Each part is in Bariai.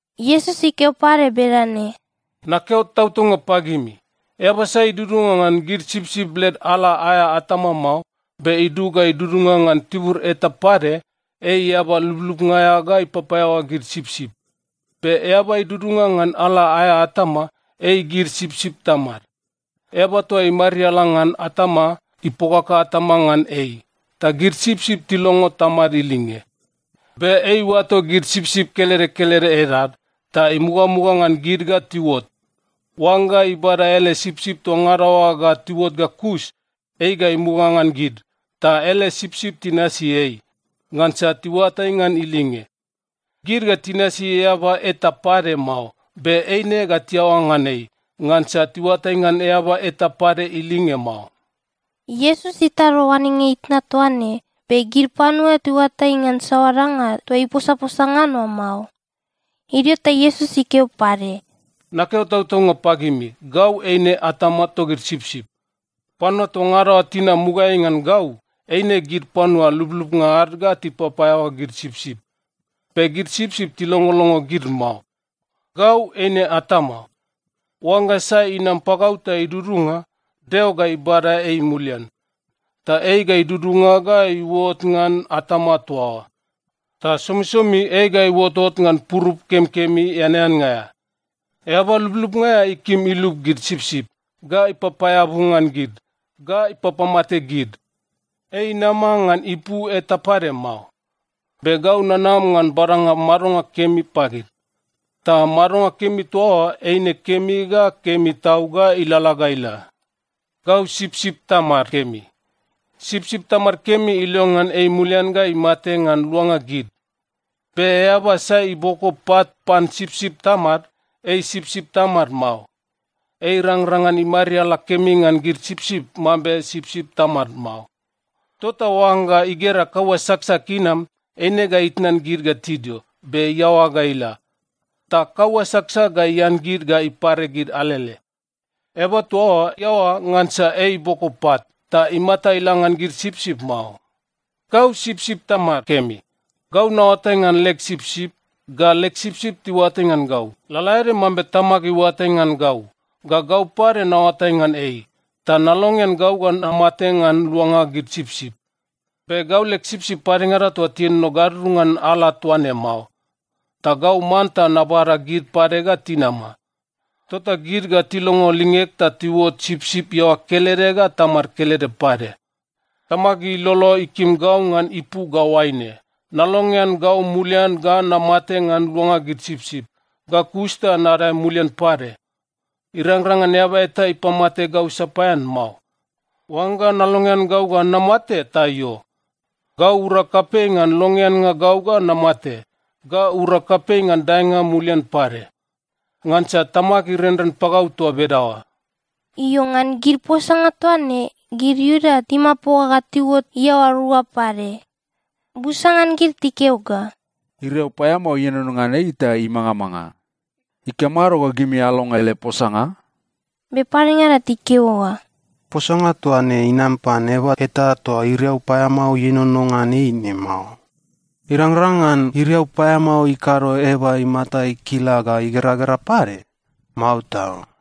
Iesus ikeo pade bedane, “Nakeo tautaunga pagimi, eaba sai idudunga ngan gid sipsip led ala aea atama mao, be idug ga idudunga ngan tibur eta pade, ei eaba lublubnga aea ga ipapaeaoa gid sipsip. Be eaba idudunga ngan ala aea atama, ei gid sipsip tamad. Eaba toa imariala ngan atama, ipokaka atama ngan ei, ta gid sipsip tilongo tamad ilinge. Be ei iuato gid sipsip kelede kelede edad, ta imugamuga ngan gid ga tiuot. Oangga ibada ele sipsip toa ngada oa ga tiuot ga kus, ei ga imuga ngan gid, ta ele sipsip tinasi ei, ngansa tiuatai ngan ilinge. Gid ga tinasi eaba eta pade mao, be eine ga tiaoa ngan ei, ngansa tiuatai ngan eaba eta pade ilinge mao.” Iesus itado oanenga itna toa ne, be gid panua tiuatai ngan saoa danga toa iposaposa ngan oa mao. Idio ta Iesus ikeo pade, “Nakeo tautaunga pagimi, gau eine atama togid sipsip. Panua toa ngada oa tinam mugaeai ngan gau, eine gid panua lublubnga ad ga tipapaeaoa gid sipsip. Be gid sipsip tilongolongo gid mao. Gau eine atama. Oangga sai inam pagau ta idudunga, Deo ga ibada ei mulian. Ta ei ga idudunga ga iuot ngan atama toa oa. Ta somisomi ei ga iuotot ngan purup kemikemi eaneannga aea. Eaba lublubnga aea ikim ilub gid sipsip, ga ipapaeabu ngan gid, ga ipapamate gid. Ei inama ngan ipu eta pade mao. Be gau nanam ngan badanga madonga kemi pagid. Ta madonga kemi toa oa eine kemi ga kemi tau ga ilalala ga ila. “Gau sipsip tamad kemi. Sipsip tamad kemi ilongean ei mulian ga imate ngan luanga gid. Be eaba sai iboko pat pan sipsip tamad, ei sipsip tamad mao. Ei irangrang ngan imariala kemi ngan gid sipsip mambe sipsip tamad mao. Tota oangga igera kaua saksak inam, eine ga itnan gid ga tidio, be iaoa ga ila. Ta kaua saksak ga ian gid ga ipare gid alele. Eaba toa oa iaoa ngansa ei iboko pat, ta imata ila ngan gid sipsip mao. “Gau sipsip tamad kemi. Gau naoatai ngan leg sipsip, ga leg sipsip tiuatai ngan gau, lalaede mambe Tamag iuatai ngan gau, ga gau pade naoatai ngan ei. Ta nalongean gau ga namate ngan luanga gid sipsip. Be gau leg sipsip padengada toa tienono gadudunga ngan ala toa ne mao. Ta gau manta nabada gid pade ga tinama. Tota gid ga tilongo lingeg ta tiuot sipsip iaoa kelede ga tamad kelede pade. Tamag ilolo ikim gau ngan ipu ga oaine: Nalongean gau mulian ga namate ngan luanga gid sipsip, ga kus ta nadae mulian pade. Irangrang ngan eaba eta ipamate gau sapaean mao. Oangga nalongean gau ga namate, ta io. Gau urag kapei ngan longeannga gau ga namate, ga urag kapei ngan daenga mulian pade. Ngansa Tamag irenren pagau toa bedaoa.” Io, ngan gid posanga toa ne, gid Iuda timapoga ga tiuot iaoa rua pade. Busa ngan gid tikeo ga, “Iriau paeamao ienono ngan ei ta imangamanga. Ikamado ga gimi alongo ele posanga?” Be padengada tikeo ga, “Posanga toa ne inam pan eaba eta toa iriau paeamao ienono ngan ei ne mao. Irangrang ngan iriau paeamao ikado eaba imata ikila ga igeragera pade? Mao tau!”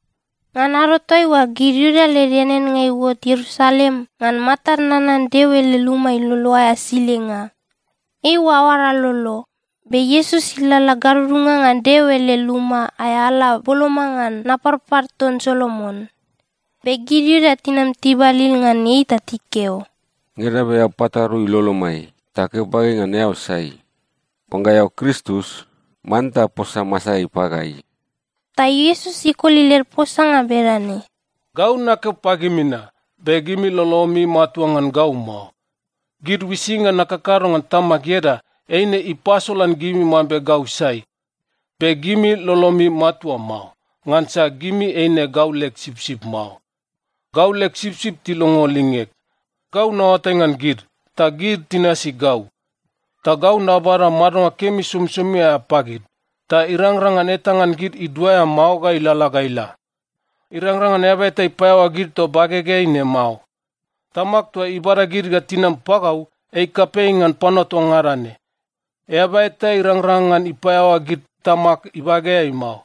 Ngan ado toaiua, gid Iuda led eaneannga iuot Ierusalem ngan Matad Nanan Deo ele Luma Ilolo aea Silenga. Eiua aoara lolo. Be Iesus ilalala gadudunga ngan Deo ele luma aea ala boloma ngan Naparpar ton Solomon. Be gid Iuda tinam tibalil ngan ei ta tikeo, “Ngeda be eao patarui lolomai ta keo pagai ngan eao sai? Oangga eao Kristus, manta posa masaeai pagai.” Ta Iesus ikoli led posanga bedane, “Gau nakeo pagimi na, be gimi lolomi matua ngan gau mao. Gid uisinga nakakado ngan Tamag ieda, eine ipasolan gimi mambe gau sai. Be gimi lolomi matua mao, ngansa gimi eine gau leg sipsip mao. Gau leg sipsip tilongo lingeg. Gau naoatai ngan gid, ta gid tinasi gau. Ta gau nabada madonga kemi somisomi aea pagid, ta irangrang ngan eta ngan gid iduaea mao ga ilalala ga ila. Irangrang ngan eaba eta ipaeaoa gid toa bagegeai ne mao. Tamag toa ibada gid ga tinam pagau, ei kapei ngan panua toa ngada ne. Eaba eta irangrang ngan ipaeaoa gid Tamag ibageai mao.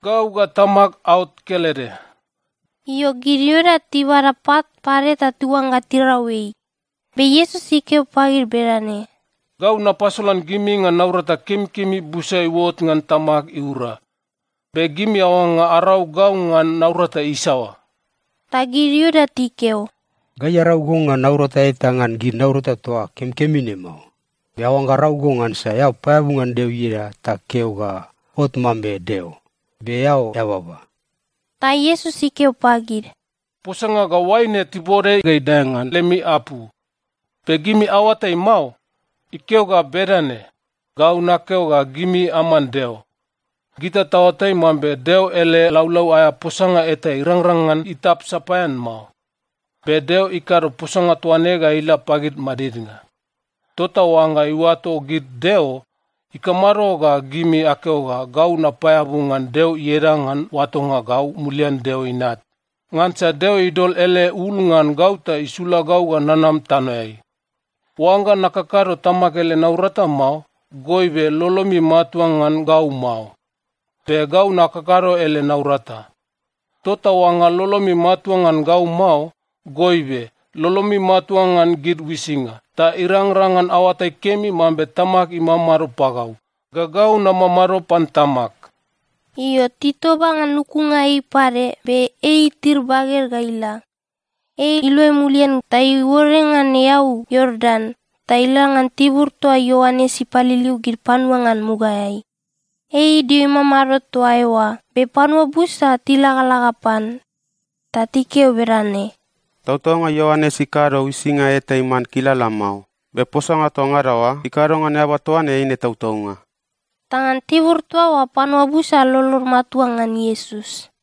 Gau ga Tamag aot kelede.” Io, gid Iuda tibada pat pade ta tiuangga tirau ei, be Iesus ikeo pagid bedane, “Gau napasolan gimi ngan naurata kemikemi busa iuot ngan Tamag iura. Be gimi aoangga arau gau ngan naurata isaoa?” Ta gid Iuda tikeo, “Gai arau go ngan naurata eta ngan gid naurata toa kemikemi ne mao, be aoangga arau go ngansa eao paeabu ngan Deo ieda ta keo ga ot mambe Deo, be eao eababa.” Ta Iesus ikeo pagid, “Posanga ga oaine tibode ga idae ngan lemi apu. Be gimi aoatai mao? Ikeo ga bedane, ‘Gau nakeo ga gimi aman deo.’ Gita taoatai mambe Deo ele laulau aea posanga eta irangrang ngan itap sapaean mao. Be Deo ikado posanga toa ne ga ila pagid madidnga. Tota oangga iuato gid deo, ikamado ga gimi akeo ga gau napaeabu ngan Deo ieda ngan oatonga gau mulian Deo Inat? Ngansa Deo idol ele ul ngan gau ta isula gau ga nanam tanoeai. Oangga nakakado Tamag ele naurata mao, goibe lolomi matua ngan gau mao. Be gau nakakado ele naurata. Tota oangga lolomi matua ngan gau mao, goibe lolomi matua ngan gid uisinga, ta irangrang ngan aoatai kemi mambe Tamag imamado pagau, ga gau namamado pan Tamag.” Io, titoba ngan lukunga ei pade, be ei itir baged ga ila. Ei iluai mulian ta iuore ngan eau Iordan, ta ila ngan tibur toa Ioanes ipaliliu gid panua ngan mugaeai. Ei idio imamado toa eoa be panua busa tilagalaga pan. Ta tikeo bedane, “Tautaunga Ioanes ikado uisinga eta iman kilala mao, be posanga toa ngada oa ikado ngan eaba toa ne eine tautaunga.” Ta ngan tibur toa oa panua busa lolod matua ngan Iesus.